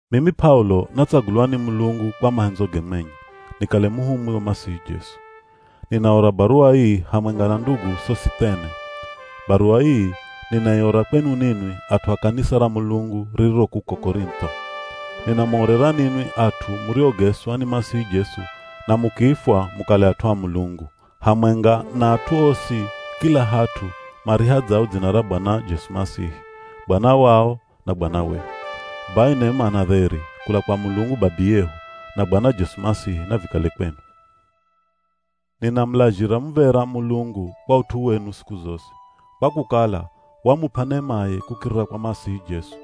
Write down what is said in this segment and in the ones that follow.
Mimi P'aulo natsagulwa ni Mulungu kwa mahendzoge mwenye, nikale muhumwi wa Masihi Jesu. Ninaora baruwa ii hamwenga na ndugu Sosithene. Baruwa ii ninaiora kwenu ninwi at'u a kanisa ra Mulungu ririro kuko Korintho. Ninamuorera ninwi at'u muriogeswa ni Masihi Jesu na mukiifwa mukale at'u a Mulungu, hamwenga na at'u osi kila hat'u marihadzao dzina ra Bwana Jesu Masihi, Bwana wao na Bwana wehu. Bai nema na dheri kula kwa Mulungu Babiyehu, na Bwana Jesu Masihi, navikale kwenu. Ninamulazhira muv̱era Mulungu kwa ut'u wenu siku zosi, kwa kukala wamup'a nemaye kukirira kwa Masihi Jesu.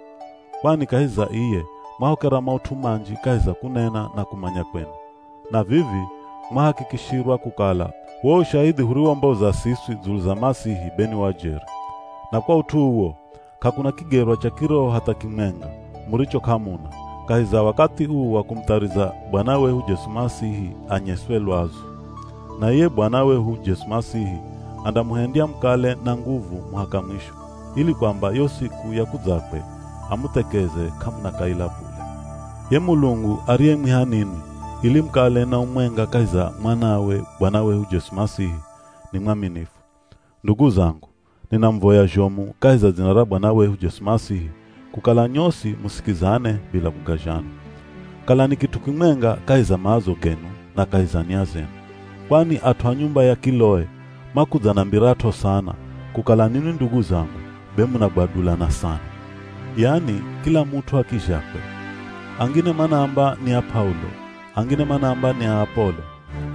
Kwani kahi za iye mwahokera maut'u manji kahi za kunena na kumanya kwenu. Na vivi mwahakikishirwa kukala wo ushahidhi huriwomboza siswi dzulu za Masihi be ni wa jeri. Na kwa ut'u uwo, k'akuna kigerwa cha kiroho hatha kimwenga muricho k'amuna, kahi za wakathi uu wa kumuthariza Bwana wehu Jesu Masihi anyeswe lwazu. Na iye Bwana wehu Jesu Masihi andamuhendya mukale na nguvu muhaka mwisho, ili kwamba yo siku ya kudzakwe amuthekeze k'amuna kaila bule. Ye Mulungu ariyemwiha ninwi, ili mukale na umwenga kahi za mwanawe Bwana wehu Jesu Masihi, ni mwaminifu. Ndugu zangu, ninamuvoya zhomu kahi za dzina ra Bwana wehu Jesu Masihi kukala nyosi musikizane bila kugazhana. Kalani kit'u kimwenga kahi za maazo genu na kahi za nia zenu. Kwani at'u a nyumba ya Kiloe, makudzanambirat'o sana, kukala ninwi ndugu zangu be munagwadulana sana. Yani kila mut'u a kizhakwe. Angine manaamba ni a P'aulo, angine manaamba ni a Apolo,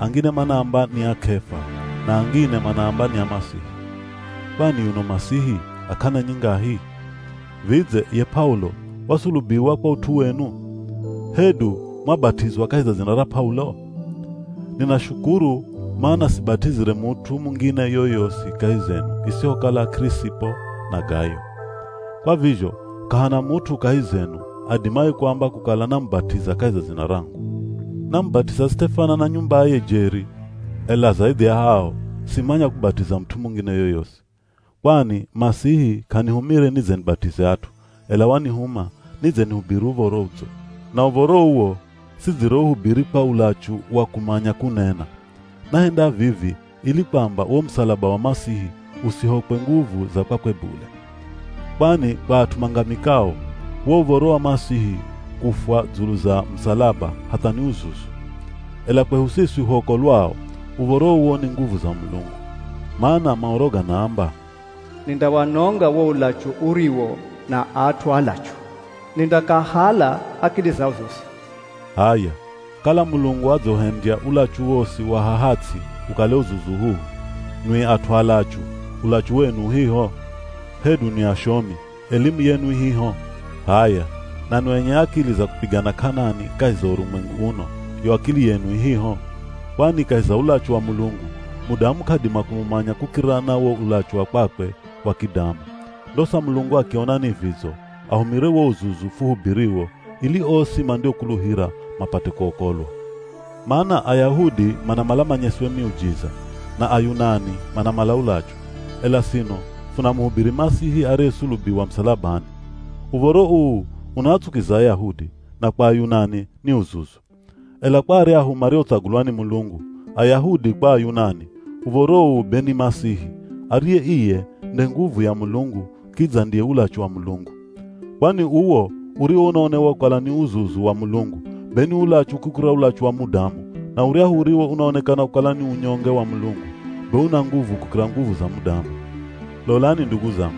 angine manaamba ni a K'efa, na angine manaamba ni a Masihi. Kwani yuno Masihi a k'ana nyingahi? Vidze, ye P'aulo wasulubiwa kwa ut'u wenu? Hedu mwabat'izwa kahi za dzina ra P'aulo? Ninashukuru mana sibat'izire mut'u mungine yoyosi kahi zenu isihokala K'irisipo na Gayo. Kwa vizho k'ahana mut'u kahi zenu adimaye kuamba kukala namubat'iza kahi za dzina rangu. (Namubat'iza Sitefana na nyumbaye jeri. Ela zaidhi ya ao, simanya kubat'iza mut'u mungine yoyosi.) Kwani Masihi k'anihumire nidze nibat'ize at'u, ela wanihuma nidze nihubiri Uv̱oro Udzo. Na Uv̱oro uwo sidzireuhubiri kwa ulachu wa kumanya kunena. Nahenda vivi ili kwamba wo musalaba wa Masihi usihokwe nguvu za kwakwe bule. Kwani kwa at'u mangamikao, wo uv̱oro wa Masihi kufwa dzulu za musalaba hatha ni uzuzu. Ela kwehu siswi huokolwao, uv̱oro uwo ni nguvu za Mulungu. Mana Maoro ganaamba, “Nindawanonga wo ulachu uriwo na at'u alachu, nindakahala akili zao zosi.” H'aya, kala Mulungu adzauhendya ulachu wosi wa haha ts'i ukale uzuzu uhuhu, nwi at'u alachu, ulachu wenu uhiho? Hedu nwi ashomi, elimu yenu ihiho? H'aya nanwi enye akili za kupigana k'anani kahi za urumwengu uno, yo akili yenu ihiho? Kwani kahi za ulachu wa Mulungu, mudamu k'adima kumumanya kukirira na wo ulachu wa kwakwe wa kidamu. Ndosa Mulungu akiona ni vidzo ahumire wo uzuzu fuhubiriwo ili osi mandiokuluhira mapate kuokolwa. Mana Ayahudi manamala manyeswe miujiza, na Ayunani manamala ulachu, ela sino funamuhubiri Masihi ariyesulubiwa musalabani. Uv̱oro uu unaatsukiza Ayahudi, na kwa Ayunani, ni uzuzu. Ela kwa aryahu mariotsagulwa ni Mulungu, Ayahudi kwa Ayunani, uv̱oro uu be ni Masihi, ariye iye nde nguvu ya Mulungu kidza ndiye ulachu wa Mulungu. Kwani uwo uriwo unaonewa kukala ni uzuzu wa Mulungu, be ni ulachu kukira ulachu wa mudamu, na uryahu uriwo unaonekana kukala ni unyonge wa Mulungu, be una nguvu kukira nguvu za mudamu. Lolani ndugu zangu,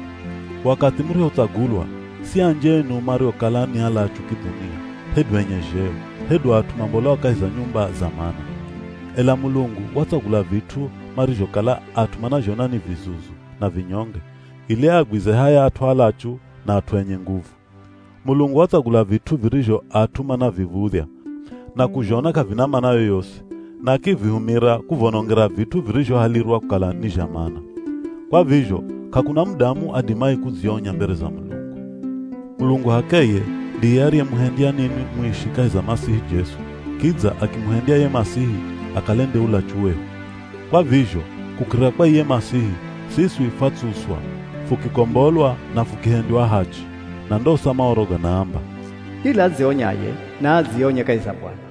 wakathi murihotsagulwa, si anji enu mariokala ni alachu kidhunia, hedu enye zheo, hedu at'u mambolao kahi za nyumba za mana. Ela Mulungu watsagula vit'u marizhokala at'u manazhona ni vizuzu na vinyonge ili aagwize haya at'u alachu, na at'u enye nguvu. Mulungu watsagula vit'u virizho at'u manaviv̱udhya na kuzhona k'avina mana yoyosi, na akivihumira kuvonongera vit'u virizhohalirwa kukala ni zha mana. Kwa vizho k'akuna mudamu adimaye kudzionya mbere za Mulungu. Mulungu h'akeye ndiye ariyemuhendya ninwi muishi kahi za Masihi Jesu, kidza akimuhendya ye Masihi akale nde ulachu wehu. Kwa vizho kukirira kwa iye Masihi siswi fwatsuswa, fukikombolwa na fukihendywa ahachi. Na ndosa Maoro ganaamba, “Kila adzionyaye, naadzionye kahi za Bwana.”